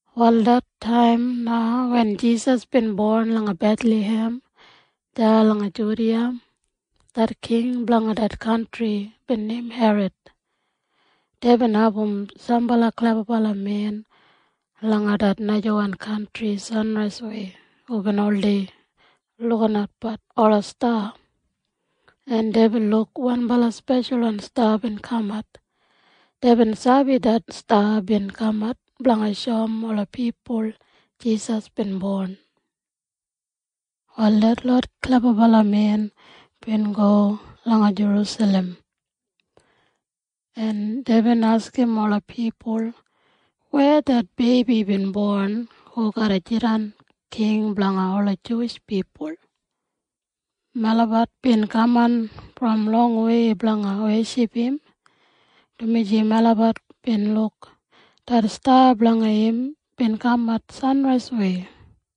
Wal det taim na wen Jisas bin bon langa Bethlahem, deya langa Judiya, det king blanga det kantri bin neim Herod. Deibin abum sambala klebabalamen langa det najawan kantri sanraiswei hubin oldei lukinatbat ola sta, en deibin luk wanbala speshalwan sta bin kamat. Deibin sabi det sta bin kamat blanga shoum ola pipul Jisas bin bon. Wal detlot klebabalamen bin go langa Jerusalem, en deibin askim ola pipul, “Weya det beibi bin bon hu garra jidan king blanga ola Juwish pipul? Melabat bin kaman brom longwei blanga weship im, dumaji melabat bin luk det sta blanga im bin kamat sanraiswei.”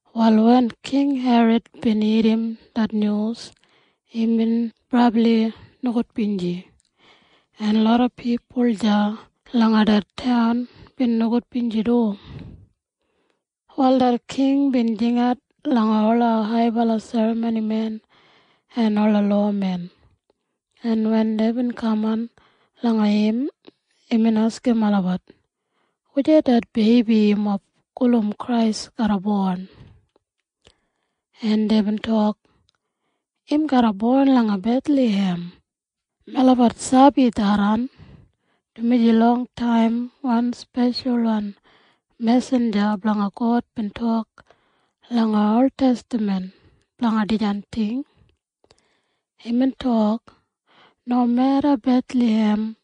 Wal wen King Herod bin irrim det nyus, imbin brabli nogudbinji, en loda pipul deya langa det taun bin nogudbinji du. Wal det king bin jingat langa ola haibala serramonimen en ola lowamen, en wen deibin kaman langa im, imbin askim olabat, “Wujei det beibi yumob gulum Krais garra bon?” En deibin tok, “Im garra bon langa Bethlahem. Melabat sabi tharran, dumaji longtaim wan speshalwan mesinja blanga God bin tok langa oltestaman blanga dijan ting. Imbin tok, ‘Nomeda Bethlahem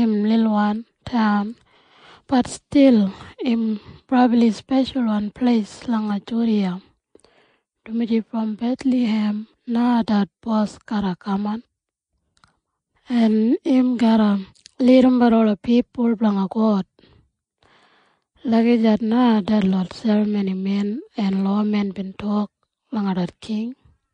im lilwan taun, bat stil im brabli speshalwan pleis langa Judiya, dumaji brom Bethlahem na det bos garra kamat, en im garra lidimbat ola pipul blanga God.’” Lagijat na detlot serramonimen en lowamen bin tok langa det king.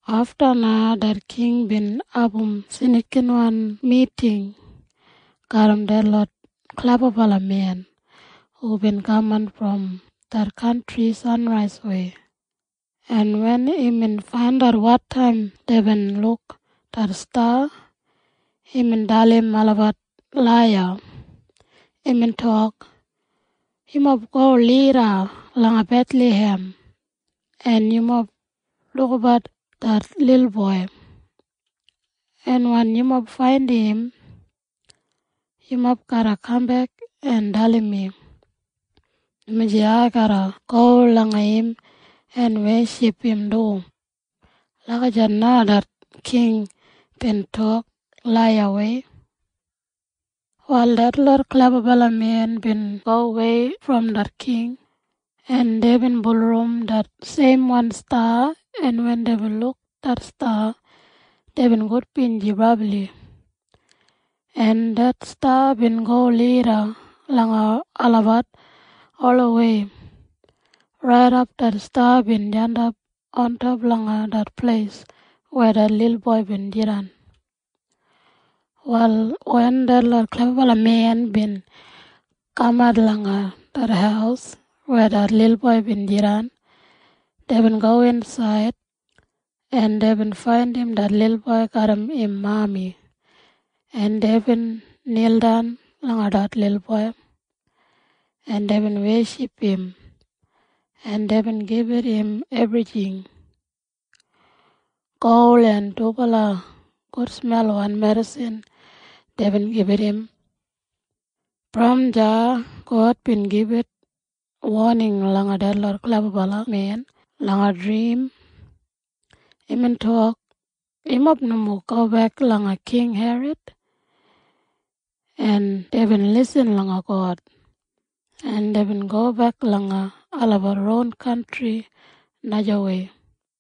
Afta na det king bin abum snikinwan miting garram detlot klebabalamen hubin kaman brom det kantri sanraiswei, en wen imbin faindat wotaim deibin luk det sta, imbin dalim olabat laiya. Imbin tok, “Yumob go lida langa Bethlahem, en yumob lukabat det lilboi, en wen yumob faindim im, yumob garra kambek en dalim mi, dumaji ai garra go langa im en weship im du.” Lagijat na det king bin tok laiyawei. Wal detlot klebabalamen bin gowei brom det king, en deibin bulurrum det seimwan sta en wen deibin luk det sta, deibin gudbinji brabli, en det sta bin go lida langa olabat olawei raidap det sta bin jandap ontop langa det pleis weya det lilboi bin jidan. Wal wen detlot klebabalamen bin kamat langa det haus weya det lilboi bin jidan, deibin gowin insaid, en deibin faindim det lilboi garram im mami, en deibin nildan langa det lilboi, en deibin weship im, en deibin gibit im ebrijing. Gol en dubala gudsmelwan medisin deibin gibit im. Brom deya God bin gibit woning langa detlot klebabalamen langa drim. Imbin tok, “Yumob nomo gobek langa King Herod.” En deibin lisin langa God, en deibin gobek langa olabat ron kantri najawei.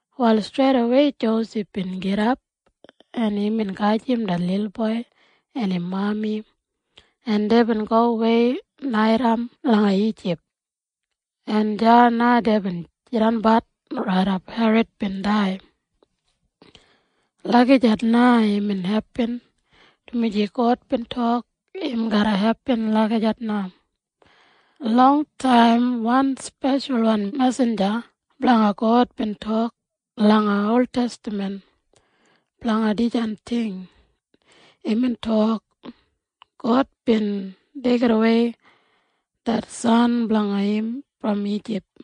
Wal streidawei Josef bin gidap, en imbin gajim det lilboi en im mami, en deibin gowei naitaim langa Ijip, en deya na deibin jidanbat raidap Herod bin dai. Lagijat na imbin hepin, dumaji God bin tok im garra hepin lagijat na. Longtaim wan speshalwan mesinja blanga God bin tok langa oltestaman blanga dijan ting. Imbin tok, “God bin deigidawei det San blanga im brom Ijip.”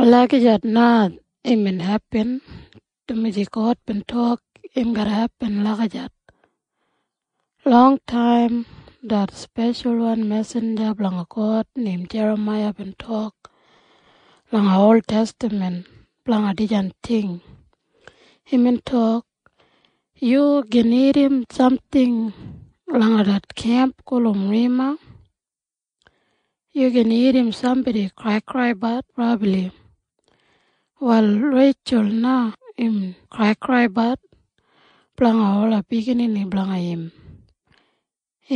Lagijat na imbin hepin, dumaji God bin tok im garra hepin lagijat. Longtaim det speshalwan mesinja blanga God neim Jeramaiya bin tok langa oltestaman blanga dijan ting. Imbin tok, “Yu gin irrim samting langa det kemp gulum Rema. Yu gin irrim sambodi kraikraibat brabli. Wal Reitjul na im kraikraibat blanga ola biginini blanga im.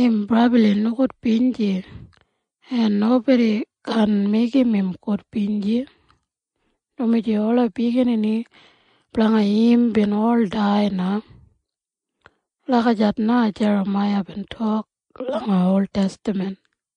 Im brabli nogudbinji, en nobodi kaan meigim im gudbinji, dumaji ola biginini blanga im bin ol dai na.” Lagijat na Jeramaiya bin tok langa oltestaman.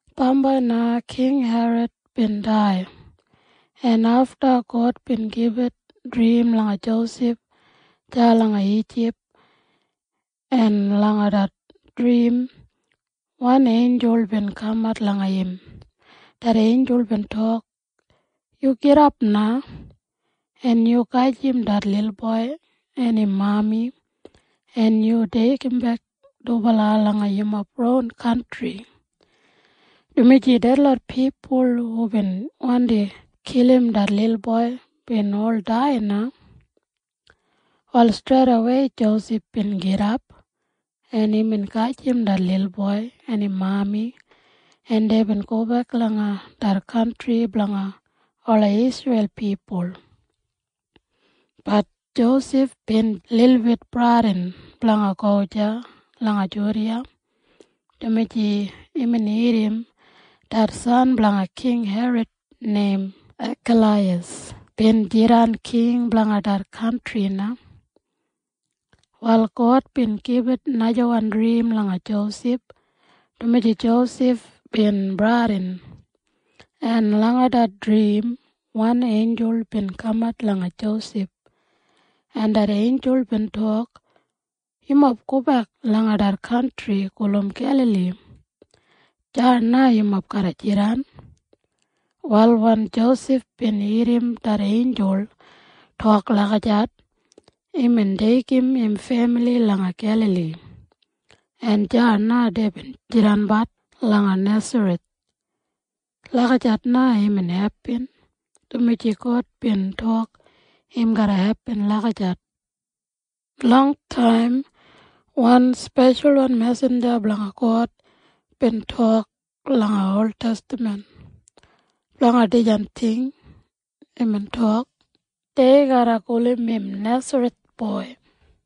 Bambai na King Herod bin dai, en afta God bin gibit drim langa Josef deya langa Ijip, en langa det drim wan einjul bin kamat langa im. Det einjul bin tok, “Yu gidap na, en yu gajim det lilboi en im mami, en yu deigimbek dubala langa yumob ron kantri, dumaji detlot pipul hubin wandi kilim det lilboi bin ol dai na.” Wal streidawei Josef bin gidap, en imbin gajim det lilboi en im mami, en deibin gobek langa det kantri blanga ola Isreil pipul. Bat Josef bin lilbit bradin blanga go deya langa Judiya, dumaji imbin irrim det san blanga King Herod neim Akaleiyas bin jidan king blanga det kantri na. Wal God bin gibit najawan drim langa Josef, dumaji Josef bin bradin, en langa det drim wan einjul bin kamat langa Josef, en det einjul bin tok, “Yumob gobek langa det kantri gulum Gelali. Deya na yumob garra jidan.” Wal wen Josef bin irrim det einjul tok lagijat, imbin deigim im femili langa Gelali, en deya na deibin jidanbat langa Nesareth. Lagijat na imbin hepin, dumaji God bin tok im garra hepin lagijat. Longtaim wan speshalwan mesinja blanga God bin tok langa oltestaman blanga dijan ting. Imbin tok, “Dei garra gulum im Nesareth boi.”